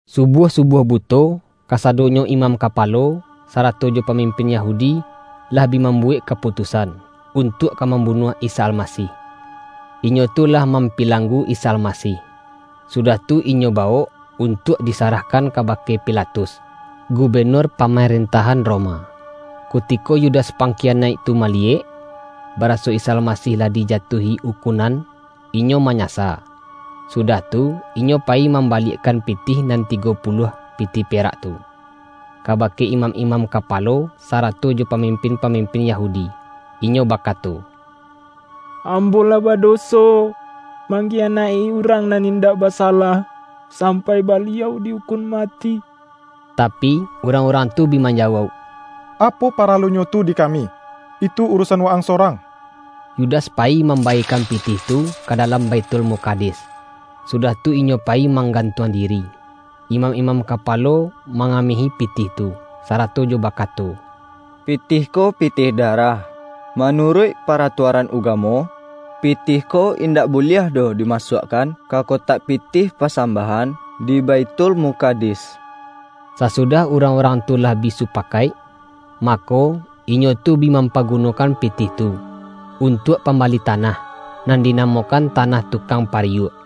Subuah-subuah buto, kasado-nyo imam kapalo, sarato jo pa-mimpin Yahudi, lah bi mambuwek ka-putusan, untuak ka mambunuah Isa Almasih. Inyo tu lah mampilanggu Isa Almasih, sudah tu inyo bawok, un-tuak disarahkan kabake Pilatus, gu-benur pamarentahan Roma. Kutiko Yudas pangkiyanaik tu ma-liyek, baraso Isa Almasih lah dijatuahi ukunan, inyo manyasa. Sudah tu, inyo payi mambaliakkan pitih nan tigo pu-luah pitih perak tu, kabake imam-imam kapalo sarato jo pamimpin-pamimpin Yahudi. Inyo bakato,”Ambo lah bado-so mangkiyanaik-i Urang nan indak ba-salah, sampai Baliau di-ukun mati!” Tapi, urang-urang tu bi manjawauk,”Apo paralunyo tu di kami? Itu urusan wa-ang sorang!” Yudas payi mambaekan pitih tu ka dalam Baithulmukadis, sudah tu inyo payi manggantuang diri. Imam-imam kapalo mangamehi pitih tu, sarato jo bakato,”Pitih ko pitih darah. Manuruik paratuaran ugamo, pitih ko in-dak buliah doh dimasuakkan ka kotak pi-tih pasambahan di Baithulmukadis.” Sasu-dah urang-urang tu lah bi supakaik, mako, inyo tu bi mampagunokan pitih tu, untuak pambali tanah, nan dinamokan Tanah Tu-kang Pariyuak.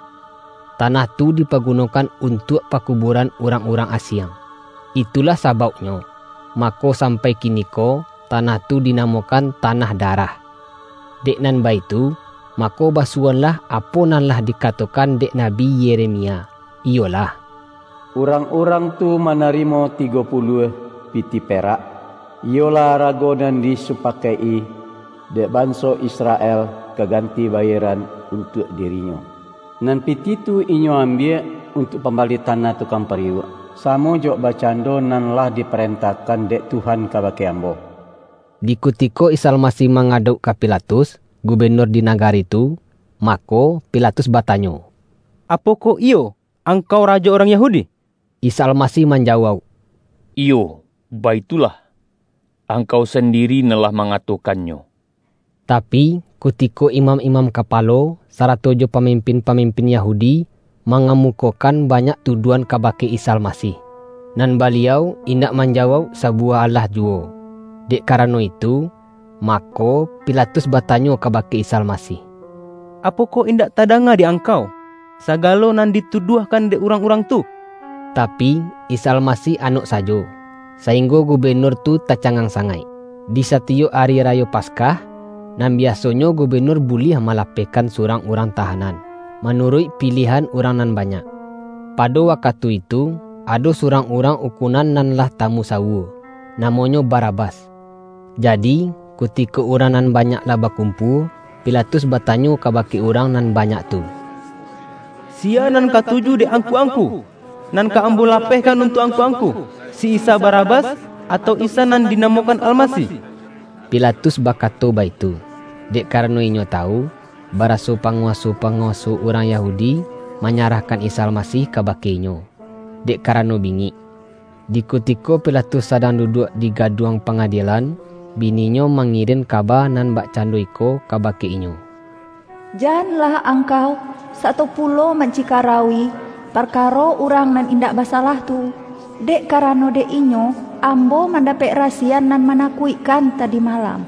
Tanah tu dipagunokan un-tuak pakubuaran urang-urang asiang. Itu-lah sabauknyo, mako sampai kiniko tanah tu dinamokan”Tanah Darah”. Dek nan baitu, mako basuwoanlah apo nan lah dikatokan dek Nabi Yeremia, iyolah,”Urang-urang tu manarimo tigo puluah pi-tih perak, iyolah arago nan disupakaik-i dek banso Israel kaganti bayieran un-tuak dirinyo. Nan pitih tu inyo am-biak untuak pambali Tanah Tukang Pariyuak, samo jo bakcando nan lah di-parentahkan dek Tuhan kabake ambo.” Di kutiko Isa Almasih mangadauk ka Pilatus, gubenur di nagari tu, ma-ko, Pilatus batanyo,”Apokoh iyo Angkau rajo urang Yahudi?” Isa Almasih manjawauk,”Iyo baitu-lah, angkau sandiri nan lah mangato-kannyo.” Tapi, kutiko imam-imam kapalo, sarato jo pamimpin-pamimpin Yahudi, mangamukokan banyak tu-duahan kabake Isa Almasih, nan Baliau indak manjawauk sabuwah alah juwo. Dek karano itu, mako, Pilatus ba-tanyo kabake Isa Almasih,”Apokoh in-dak tadanga di Angkau, sagalo nan di-tuduahkan dek urang-urang tu?” Tapi, Isa Almasih anok sajo, saing-go gubenur tu tacangang sangaik. Di satiyok Ari Rayo Paskah, nan biasonyo gubenur buliah malapehkan surang urang tahanan, manuruik pi-liahan urang nan banyak. Pado wakatu itu, ado surang urang ukunan nan lah tamusawua. Namonyo Bara-bas. Jadi, kutiko urang nan banyak lah bakumpua, Pilatus batanyo kaba-ke urang nan banyak tu,”Siya nan katuju dek angku-angku, nan ka am-bo lapehkan untuak angku-angku? Si Isa Barabas, atau Isa, nan dinamokan Almasih?” Pilatus bakato baitu, dek karano inyo tawu, baraso panguwa-so-panguwaso urang Yahudi manya-rahkan Isa Almasih kabake inyo, dek karano bingik. Di kutiko Pilatus sadang duduak di gaduang pangadielan, bininyo ma-ngirin kaba nan bakcando iko kabake inyo,”Janlah angkau sato pulo man-cikarauwi, parkaro Urang nan indak basalah tu, dek karano dek Inyo, am-bo mandapek rasiyan nan manakuik-kan tadi malam.”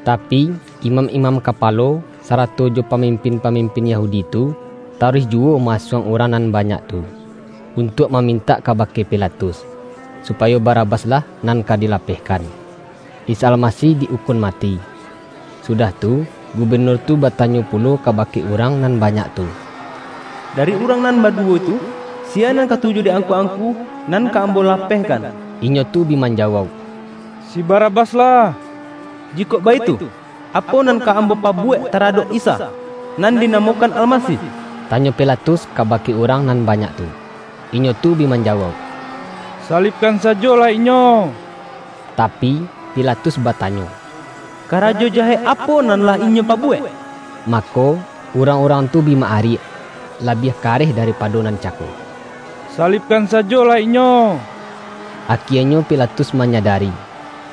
Tapi, imam-imam kapalo, sarato jo pamimpin-pamim-pin Yahudi tu, taruih juwo ma-asuang urang nan banyak tu, untuak mamin-tak kabake Pilatus, supayo Barabas-lah nan ka dilapehkan, Isa Almasih di-ukun mati. Sudah tu, gubenur tu batanyo pulo kabake urang nan ba-nyak tu,”Dari urang nan baduwo tu, siya nan katuju dek angku-angku nan ka ambo lapehkan?” Inyo tu bi manjawauk,”Si Barabas lah” ”Jikok baitu, apo nan ka ambo pabuwek taradok Isa, nan dinamo-kan Almasih?” tanyo Pilatus kabake urang nan banyak tu. Inyo tu bi manjawauk,”Salibkan sa-jolah Inyo!” Tapi, Pilatus batanyo,”Karajo ja-hek apo nan lah Inyo pabuwek?” Mako, urang-urang tu bi ma-ariak, labiah kareh daripado nan cako,”Sa-libkan sajolah Inyo!” Akienyo Pilatus manyadari,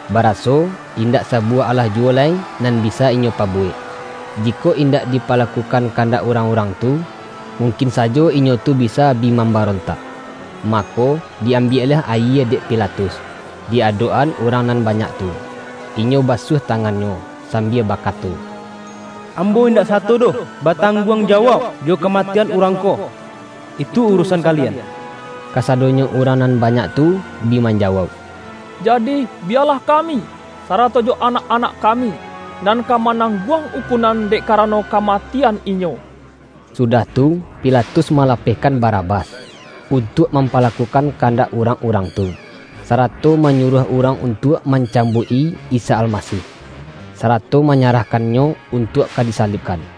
bara-so, indak sabuwah alah juwo lai nan bisa inyo pabuwek. Jikok indak di-palakukan kandak urang-urang tu, mungkin sajo inyo tu bisa bi mambarontak. Mako, di-ambiaklah ayie dek Pilatus, di adok-an urang nan banyak tu, inyo basuah tangannyo, sambia ba-kato,”Ambo indak sato doh batang-guang jawauk jo kamatian Urang ko! Itu urusan kalian!” Kasadonyo urang nan banyak tu bi manjawauk,”Jadih, biyalah kami, sarato jo anak-anak kami, nan ka manangguang ukunan dek karano kamatian Inyo!” Sudah tu, Pilatus malapehkan Ba-rabas, untuak mampalakukan kandak urang-urang tu, sarato manyuruah urang untuak mancambuik-i Isa Almasih; sarato manyarahkan-Nyo untuak ka disalibkan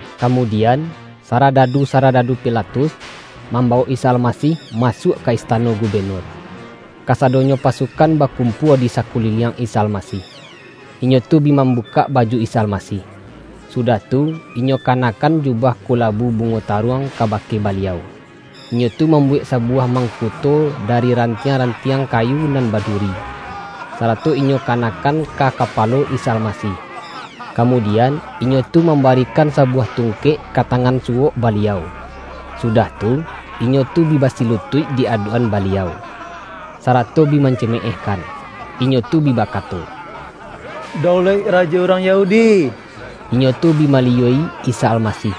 Kamudian, saradadu-saradadu Pilatus, mambawok Isa Almasih masuak ka istano gubenur, kasadonyo pasukan bakumpua di sakuliliang Isa Almasih. Inyo tu bi mam-bukak baju Isa Almasih, sudah tu, inyo ka-nakkan jubah kulabu bungo taruang kaba-ke Baliau. Inyo tu mambuwek sabuwah mangkuto dari rantiang-rantiang ka-yu nan baduri, sarato inyo kanakkan ka kapalo Isa Almasih. Kamudian, inyo tu mambarikan sabuwah tungkek ka ta-ngan suwok Baliau, sudah tu, inyo tu bi basilutuik di adok-an Baliau, sara-to bi mancimeehkan. Inyo tu bi bakato,”Daulaik Rajo Urang Yahudi!” Inyo tu bi maliyua-i Isa Almasih,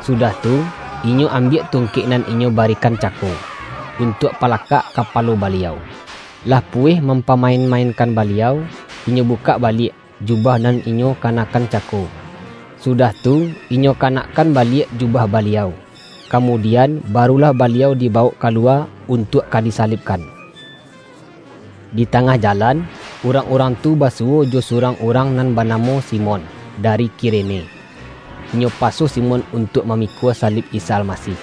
sudah tu, inyo ambiak tungkek nan inyo barikan cako, untuak palakak kapalo Baliau. Lah pu-weh mampamain-mainkan Baliau, inyo bukak baliak, jubah nan inyo kanakkan cako, sudah tu, inyo kanakkan baliak ju-bah Baliau. Kamudian, barulah Baliau dibawok kaluwa untuak ka disalibkan Di tangah jalan, urang-urang tu basuwo jo surang urang nan banamo Simon dari Kirene. Inyo paso Simon untuak mamikua salib Isa Almasih.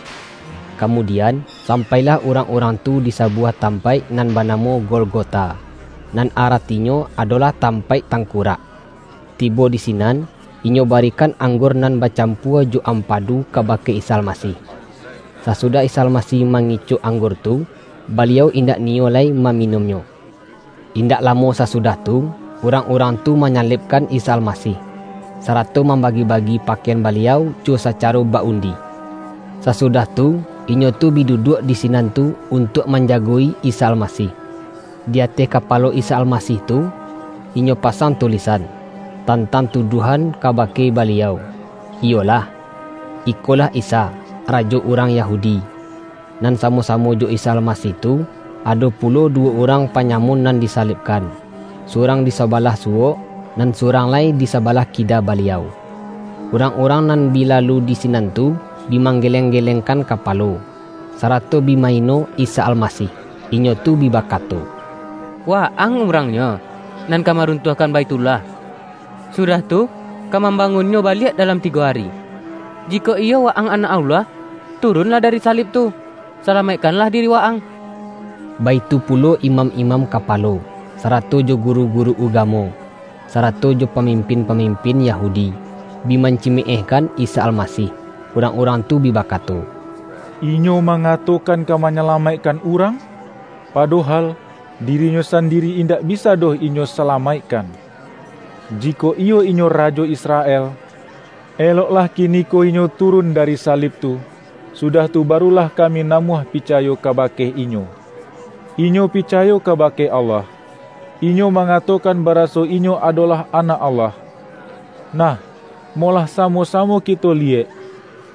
Kamudian, sampailah urang-urang tu di sabuwah tampaik nan banamo Golgota, nan aratinyo adolah”Tam-paik Tangkurak”. Tibo di sinan, inyo barikan anggur nan bacampua jo am-padu kabake Isa Almasih. Sasudah Isa Almasih mangicok anggur tu, Baliau indak niyo lai maminunnyo. Indak lamo sasudah tu, urang-urang tu manyalibkan Isa Almasih, sarato mambagi-bagi pakaian Baliau jo sacaro ba-undi. Sasudah tu, inyo tu bi duduak di sinan tu untuak man-jago-i Isa Almasih. Di ateh kapalo Isa Almasih tu, inyo pasang tulisan, tan-tang tuduahan kabake Baliau, iyolah:”Ikolah Isa, Rajo Urang Yahudi”. Nan samo-samo jo Isa Almasih tu, ado pu-lo duwo urang panyamun nan disalib-kan; surang di sabalah suwok, nan su-rang lai di sabalah kida Baliau. Urang-urang nan bi lalu di sinan tu, bi manggeleng-gelengkan kapalo, sarato bi ma-ino Isa Almasih. Inyo tu bi ba-kato,”Wa-ang urangnyo, nan ka marun-tuahkan Baithullah, sudah tu ka mam-bangunnyo baliak dalam tigo ari! Jikok iyo Wa-ang Anak Allah, turunlah dari salib tu, salamaikkanlah diri Wa-ang!” Baitu pulo imam-imam kapalo, sarato jo guru-guru ugamo, sarato jo pamimpin-pamimpin Yahudi, bi man-cimeehkan Isa Almasih. Urang-urang tu bi bakato, ”Inyo mangatokan ka manyalamaikkan urang, padohal, di-ri-Nyo sandiri indak bisa doh Inyo sa-lamaikkan! Jikok iyo Inyo rajo Israel, eloklah kiniko Inyo turun dari salib tu, sudah tu barulah kami namuah pica-yo kabake Inyo. Inyo picayo kabake Allah, Inyo mangatokan baraso Inyo adolah Anak Allah. Nah, molah samo-samo kito liyek,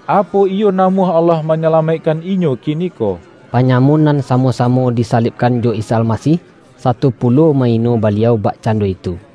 apo iyo namuah Allah manyalamaikkan Inyo kiniko.” Panyamun nan samo-samo disa-libkan jo Isa Almasih, sato pulo ma-ino Baliau bakcando itu.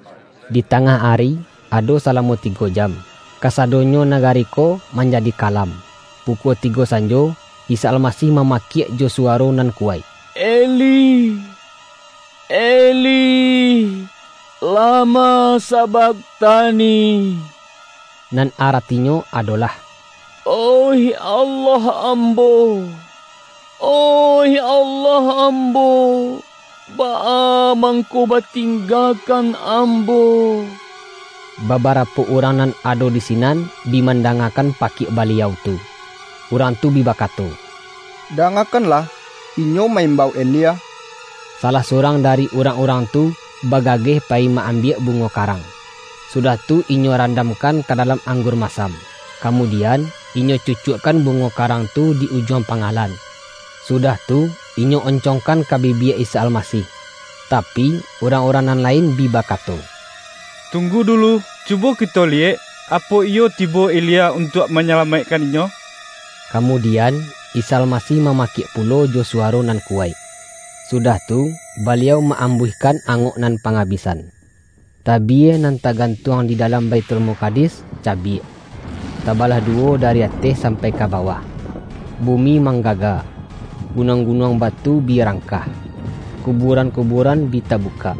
Di tangah ari, ado salamo tigo jam, kasadonyo nagari ko manjadi ka-lam. Pukua tigo sanjo, Isa Almasih ma-makiak jo suwaro nan kuwaik,”Eli, Eli, lama sabakhtani?” nan aratinyo adolah,”Oih Allah Ambo, oih Allah Ambo, baa mangko batinggakan Ambo?” Babarapo urang nan ado di si-nan bi mandangakan pakiak Baliau tu, urang tu bi bakato,”Dangakan-lah Inyo ma-imbau Elia!” Salah su-rang dari urang-urang tu, bagageh pa-yi ma-ambiak bungo karang, sudah tu inyo randamkan ka dalam anggur masam. Kamudian, inyo cucuakkan bungo karang tu di ujuang pangalan, sudah tu, inyo oncongkan ka bibia Isa Almasih. Tapi, urang-urang nan lain bi ba-kato,”Tunggu dulu, cubo kito liyek, apo iyo tibo Elia untuak manyalamaik-kan Inyo!” Kamudian, Isa Almasih mama-kiak pulo jo suwaro nan kuwaik, su-dah tu, Baliau ma-ambuihkan angok nan pangabisan. Tabie nan tagantuang di dalam Baithulmukadis cabiak, tabalah du-wo dari ateh sampai ka bawah. Bumi manggaga, gunuang-gunuang batu bi rangkah. Kubuaran-kubuaran bi ta-bukak,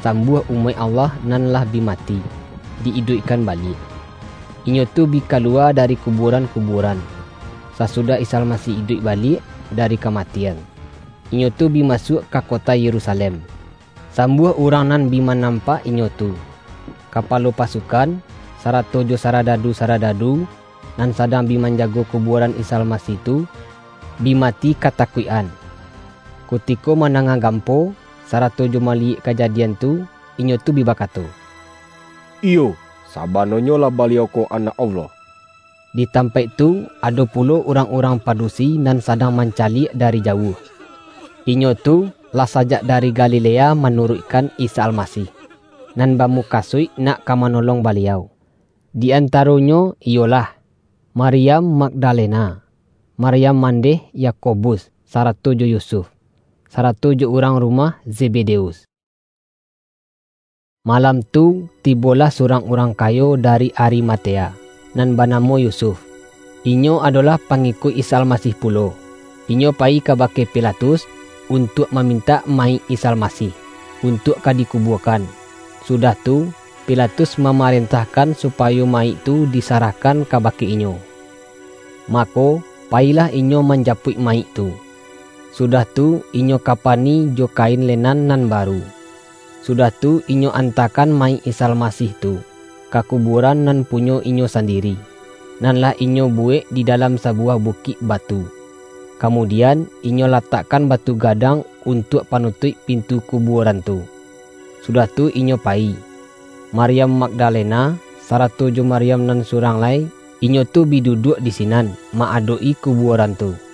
sambuah umaik Allah nan lah bi mati, di-iduikkan baliak. Inyo tu bi kaluwa dari kubuaran-kubuaran, sasudah Isa Almasih iduik baliak da-ri kamatian. Inyo tu bi masuak ka ko-ta Yerusalem, sambuah urang nan bi manampak inyo tu. Kapalo pasukan, sarato jo sarada-du-saradadu, nan sadang bi manjago kubuaran Isa Almasih tu, bi mati ka-takuik-an, kutiko mandanga gampo sarato jo maliyek kajadian tu. Inyo tu bi bakato,”Iyo, sabananyo lah, Baliau ko Anak Allah!” Di tampaik tu ado pulo urang-urang padusi nan sadang mancaliak dari jauah. Inyo tu lah sajak dari Ga-lilea manuruikkan Isa Almasih, nan bamukasuik nak ka manolong Baliau. Di antaronyo iyolah, Maryam Mag-dalena, Maryam mandeh Yakobus sa-rato jo Yusuf, sarato jo urang rumah Zebedeus. Malam tu tibolah surang urang kayo dari Arimatea, nan banamo Yu-suf. Inyo adolah pangikuik Isa Alma-sih pulo. Inyo payi kabake Pilatus untuak mamintak mayik Isa Almasih, untuak ka dikubuakan. Sudah tu, Pi-latus mamarentahkan supayo mayik tu disarahkan kabake inyo. Mako, payilah inyo manjapuik mayik tu, su-dah tu inyo kapani jo kain lenan nan baru. Sudah tu, inyo antakan ma-yik Isa Almasih tu, ka kubuaran nan punyo inyo sandiri, nan lah inyo bu-wek di dalam sabuwah bukik batu. Kamudian, inyo latakkan batu gadang untuak panutuik pintu kubuaran tu, sudah tu inyo payi. Maryam Mag-dalena, sarato jo Maryam nan surang lai, inyo tu bi duduak di sinan ma-adok-i kubuaran tu.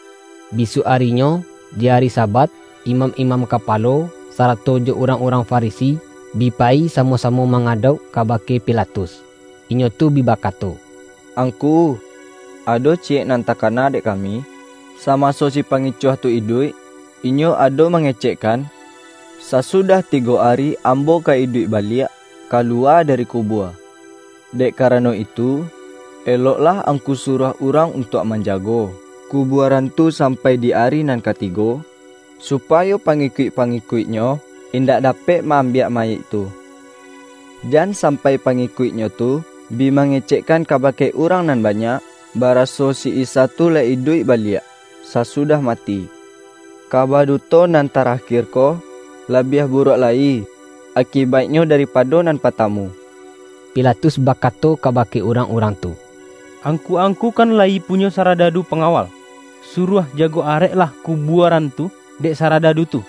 Bisuak arinyo, di ari Sabat, imam-imam kapalo, sarato jo urang-urang Farisi, bi payi samo-samo mangadauk kabake Pilatus, inyo tu bi bakato,”Angku, ado ciyek nan takana dek kami, samaso si Pangicuah tu iduik, Inyo ado mangecekkan, ’Sasudah tigo ari Ambo ka iduik baliak, kaluwa dari ku-bua.’ Dek karano itu, eloklah ang-ku suruah urang untuak manjago ku-buaran tu sampai di ari nan katigo, supayo pangikuik-pangikuik-Nyo in-dak dapek ma-ambiak mayik tu, jan sampai pangikuik-Nyo tu bi mange-cekkan kabake urang nan banyak, ba-raso si Isa tu lah iduik baliak sasu-dah mati. Kaba duto nan tarakir ko, labiah buruak lai akibaiknyo daripa-do nan partamu.” Pilatus bakato kabake urang-urang tu,”Angku-angku kan layi punyo sara-dadu pangawal, suruah jago areklah kubuaran tu, dek saradadu tu.”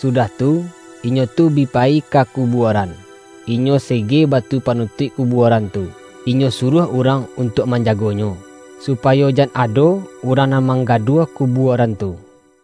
Sudah tu, inyo tu bi payi ka ku-buaran, inyo sege batu panutuik ku-buaran tu, inyo suruah urang untuak manjagonyo, supayo jan ado urang n an manggaduah kubuaran tu.